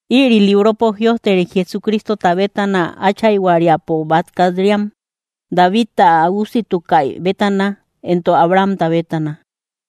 Ïri libropo jïojteri Jesucristota bétana áchayhuariapo bat kat‑riam, Davidta ä usiatukaï bétana entok Abrahamta bétana.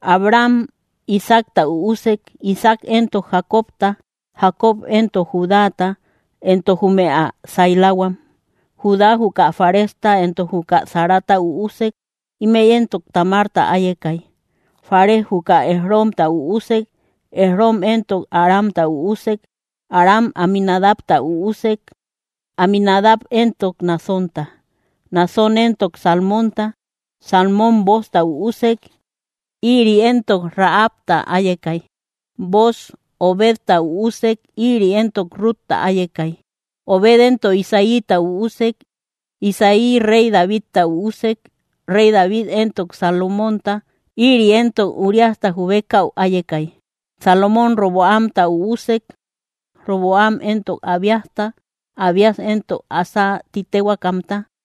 Abraham Isaacta üusek, Isaac éntok Jacobta, Jacob éntok Judáta entok jume ä sailahuam. Judá juka Faresta entok juka Zarata üusek, Ímëi éntok Tamarta áyekay. Fares juka Esromta üusek, Esrom éntok Aramta üusek. Aram Aminadabta üusek, Aminadab éntok Naasónta, Naasón éntok Salmónta. Salmón Boozta üusek; ïri éntok Rahabta áyekay. Booz Obedta üusek, ïri éntok Rutta áyekay. Obed éntok Isaíta üusek. Isaí réy Davidta üusek, réy David éntok Salomónta ïri éntok Uriasta jubekäu áyekay. Salomón Roboamta üusek, Roboam éntok Abíasta, Abías éntok Asa ti téhuaakamta.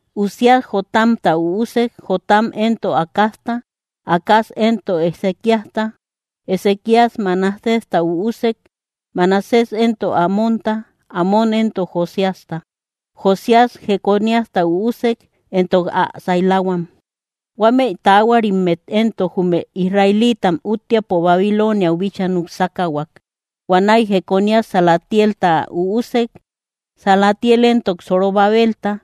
Uzías Jotamta üusek, Jotam éntok Acazta, Acaz éntok Ezequíasta. Ezequías Manasésta üusek, Manasés éntok Amónta, Amón éntok Josíasta. Josías Jeconíasta üusek, entok ä sailahuam. Huámëi taahuarimmet éntok, jume Israeliitam úttiapo Babilooniau bíchaa nuksákahuak. Huanäi Jeconías Salatielta üusek, Salatiel éntok Zorobabelta.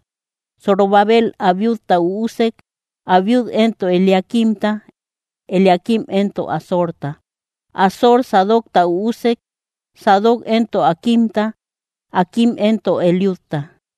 Zorobabel Abiudta üusek, Abiud éntok Eliaquimta, Eliaquim éntok Azorta. Azor Sadocta üusek, Sadoc éntok Aquimta, Aquim éntok Eliudta.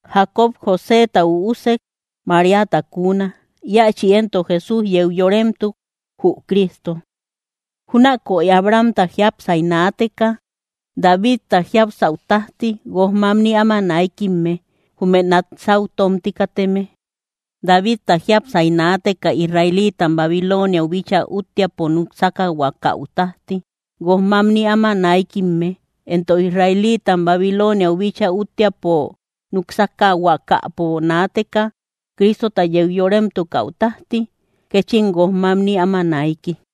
Jacob Joséta üusek, Maríata kuuna. Íachi éntok Jesús yeu yoremtuk, jü Cristo. Júnakoy Abrahamta jiápsay naateka Davidta jiapsäu tájti guoj mamni áma naikimme, jume nat sáu tómti kateme. Davidta jiápsay naateka israeliitam Babilooniau bíchaa úttiapo nuksákahuakäu tájti guoj mamni áma naikimme; entok israeliitam Babilooniau bíchaa úttiapo nuksákahuakäpo naateka Cristota yeu yoremtukäu tájti kéchim guoj mamni áma naiki.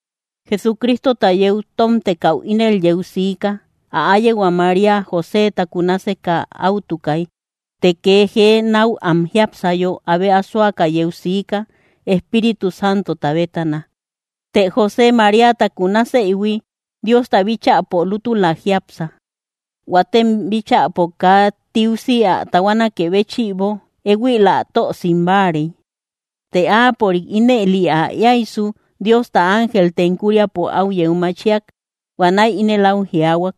Jesucristota yeu tómtekäu ínel yeu siika: Ä áyehua María Joséta kunaseka áutukay; të kee jee náu am jiápsayo abe asoaka yeu siika, Espíritu Santota bétana. Të José, Maríata kunasëihui Diosta bíchäpo lútüla jiápsa, huatem bíchäpo kaa tiusi ä tahuanakë béchïbo éhuil ä tö simbáarey. Të áapörik ínëli ä éaysu Diosta ángel tenkuriapo áu yeu machiak huanäi ínel au jiaahuak: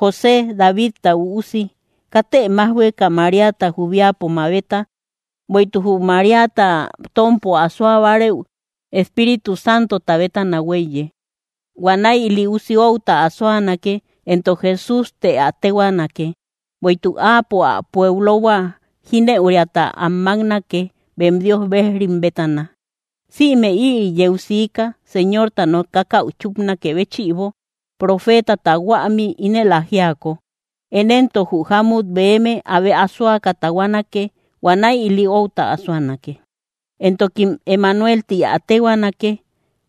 —José, Davidta üusi, katë májhueka Maríata jubiapo mabeta; bueïtuk jü Maríata tómpo asoa bárëu, Espíritu Santota bétana huéiye. Huanäi ili usi outa asoanake, entok Jesús të ä téhuaanake, bueïtuk Áapo ä pueblohua jínëuriata am máknake bem Dios bejrim bétana. Sïme ïri yeu siika Señorta nokakäu chúpnakë béchïbo profeetata huämi ínel ä jíako: Én éntok jü jámut beme abe asoaka tahuanake huanäi ili outa asoanakë; entokim Emanuel ti ä téhuaanake;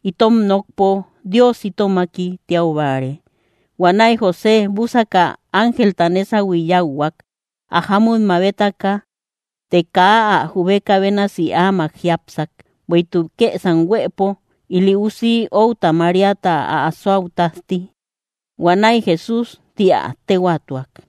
itom nokpo: “Dios itomaki”, tiau báare. Huanäi José búsaka, ángelta nésahui yáuhuak, ä jámut mabetaka. Të kaa ä jubeka bénasi amak jiápsak, bueïtuk kësam huëpo ili usi outa Maríata ä asoau tájti; huanäi Jesús ti ä téhuaatuak.